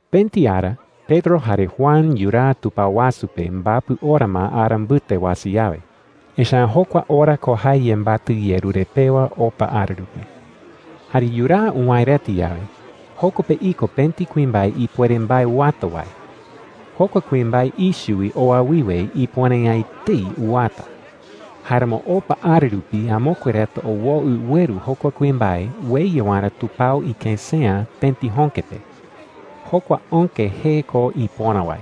Pëti ara Pedro jare Juan yuraa tupao wasu pe mbapɨ ora ma ara mbɨte uasa yawe. Echa’ä jokua ora ko jae yembatɨ yerure pewa opa ara rupi. Jare yuraa uwäe reta yawe, joko pe iko pëti kuimbae ipuere mbae uwata wae. Jokua kuimbae ichɨ wi oa wiwe ipuere’ä etei uwata. Jáeramo opa ara rupi amokue reta owoɨ ueru jokua kuimbae ueya waerä tupao ikësea pëti jöke pe. Jokua öke jee ko Ipöra wae.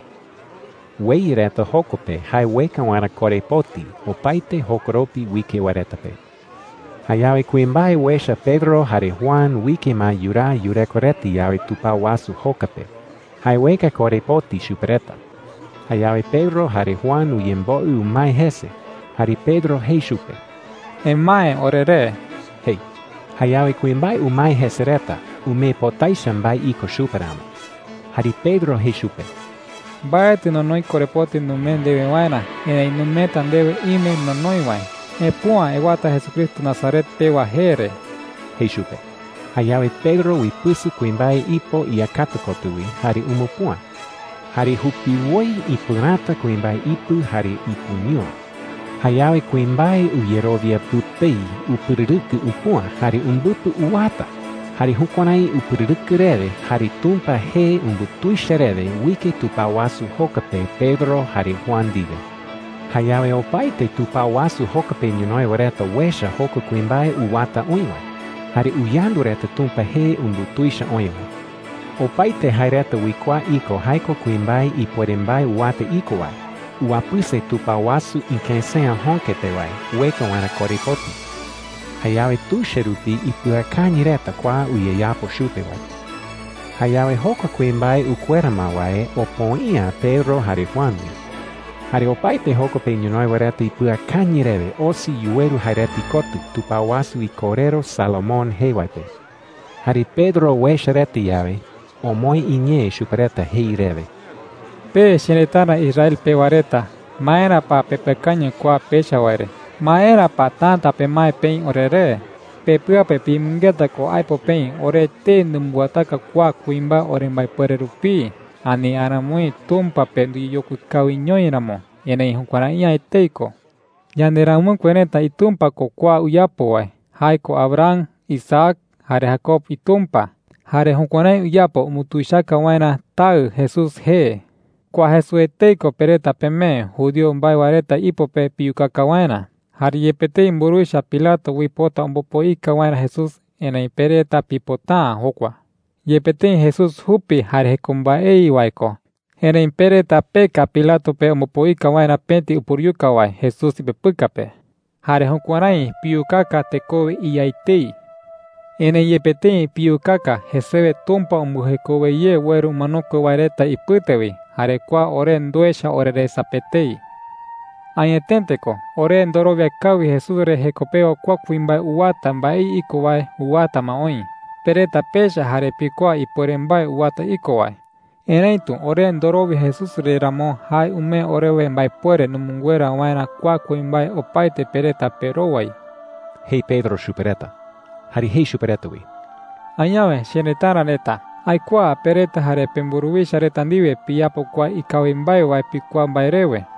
Ueya reta joko pe jae ueka waerä korepoti opaete jokoropi uike wae reta pe. Jayawe kuimbae uecha Pedro jare Juan uike ma yuraa yureko reta yawe tupao wasu joka pe, jae ueka korepoti chupe reta. Jayawe Pedro jare Juan uyemboɨ umae jese, jare Pedro jei chupe: “Emae oreré,” jei. Jayawe kuimbae umae jese reta, umee pota echa mbae iko chupe ramo. Jare Pedro jei chupe: “Mbaetɨ nonoi korepoti numee ndewe waerä. Erëi numeeta ndewe ime nonoi wae. ¡Epüa ewata Jesucristo Nazaret pewa jee re!” jei chupe. Jayawe Pedro uipɨsɨ kuimbae ipo iyakata kotɨ wi jare umupüa. ¡Jare jupiwoi ipɨräta kuimbae ipɨ jare ipɨñúa! Jayawe kuimbae uyerowia pɨpei upɨrɨrɨkɨ upüa jare umbɨpɨ uwata. Jare jukuärái upɨrɨrɨkɨ rewe jare Tumpa jee umbutuicha rewe uike tupao wasu joka pe Pedro jare Juan ndiwe. Jayawe opaete tupao wasu joka pe ñonoï wae reta uecha jokua kuimbae uwata oï wae, jare uyandu reta Tumpa jee umbutuicha oï wae. Opaete jae reta uikuaa iko jae ko kuimbae ipuere mbae uwata iko wae, uwapɨse tupao wasu ikësea jöke pe wae ueka waerä korepoti. Jayawe tuicha rupi ipɨakañɨ reta kua uyeyapo chupe wae re. Jayawe jokua kuimbae ukuera ma wae opoi’ä Pedro jare Juan wi. Jare opaete joko pe ñonoï wae reta ipɨakañɨ rewe osi yuweru jae reta ikotɨ, tupao wasu ikorero Salomón jee wae pe. Jare Pedro uecha reta yawe, omoë iñee chupe reta jei rewe: “Pe cherëtara Israel pewa reta, ¿maera pa pepɨakañɨ kua pecha wae re? ¿Maera pa täta pemae peï oreré?” jei. “Pepɨa pe piyemɨngeta ko aipo peï ore etei numbɨwataka kua kuimbae orembaepuere rupii, ani aramoi Tumpa pe nduyeyokui kawiñoi ramo. Erëi jukuärai’ä etei ko,” jei. “Yanderamɨkue reta iTumpa ko kua uyapo wae – jae ko Abraham, Isaac, jare Jacob iTumpa. Jare jukuärái uyapo umbutuichaka waerä Taɨ Jesús jee,” jei chupe reta. “Kua Jesús etei ko pe reta pemee judío mbae wae reta ipo pe piyukaka waerä. Jare yepe tëi mburuwicha Pilato uipota ombopoika waerä Jesús, erëi pe reta pipota’ä jokua. Yepe tëi Jesús jupi jare jeko mbaei wae ko, erëi pe reta peka Pilato pe ombopoika waerä pëti upuruyuka wae Jesús ipepɨka pe. Jare jukuärái piyukaka tekowe iYa etei,” jei. “Erëi yepe tëi piyukaka, jesewe Tumpa umbɨjekowe ye ueru umanokue wae reta ipɨte wi. Jare kua ore nduecha oreresa pe etei,” jei chupe reta. “Añetete ko, ore ndorowia kawi Jesús re jeko pewa kua kuimbae uwata mbaei iko wae uwata ma oï. Pe reta pecha jare pikuaa ipuere mbae uwata iko wae. Erëitu ore ndorowia Jesús re ramo, jae umee orewe mbaepuere numɨnguera waerä kua kuimbae opaete pe reta perowai,” jei Pedro chupe reta. Jare jei chupe reta wi: “Añawe cherëtara reta, aikuaa pe reta jare pemburuwicha reta ndiwe piyapo kua ikawi mbae wae pikuaa mbae rewe,” jei.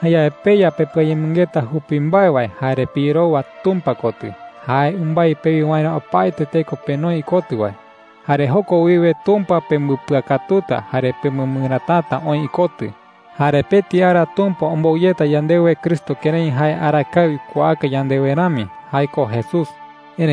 “Jayawe peya pepɨayemɨngeta jupi mbae wae jare piyerowa Tumpa kotɨ, jae umbái pewi waerä opaete teko penoi ikotɨ wae,” jei. “Jare joko wiwe Tumpa pembɨpɨakatuta jare pemɨmɨrätata oï ikotɨ,” jei. “Jare pëti ara Tumpa ombou yeta yandewe Cristo kërái jae arakae uikuaaka yandewe rami – jae ko Jesús,” jei chupe reta.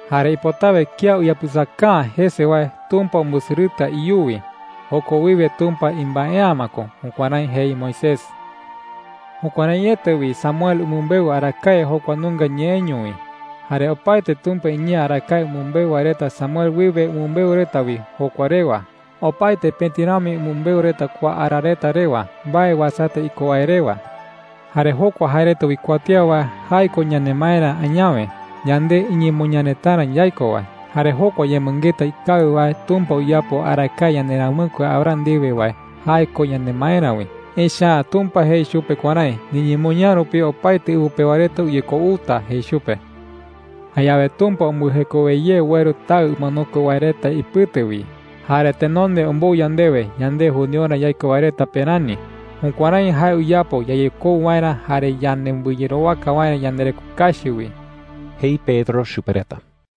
Jare ipotawe kía uyapɨsaka’ä jese wae, Tumpa umbɨsɨrɨta iyuwi. Joko wiwe Tumpa imbae’ä ma ko.’ Jukuärái jei Moisés,” jei chupe reta. “Jukuäraiete wi Samuel umɨmbeu arakae jokua nunga ñeeño wi. Jare opaete Tumpa iñee arakae umɨmbeu wae reta Samuel wiwe umɨmbeu reta wi jokua rewa. Opaete pëti rami umɨmbeu reta kua ara reta rewa, mbae uasata iko wae rewa,” jei chupe reta. “Jare jokua jae reta uikuatía wae, jae ko yanemaerä añawe, yande iñemoñaa retarä yaiko wae. Jare jokua yemɨngeta ikawi wae Tumpa uyapo arakae yanderamɨkue Abraham ndiwe wae, jae ko yanemaerä wi. Echa’ä Tumpa jei chupe kuärái: ‘Niñemoñaa rupi opaete ɨwɨ pewa reta uyekouta,’ jei chupe. “Jayawe Tumpa umbɨjekowe ye ueru Taɨ umanokue wae reta ipɨte wi jare tenonde ombou yandewe, yande judiorä yaiko wae reta pe rani. Jukuärái jae uyapo yayekou waerä jare yanembɨyerowaka waerä yandereko kachi wi,” jei Pedro chupe reta.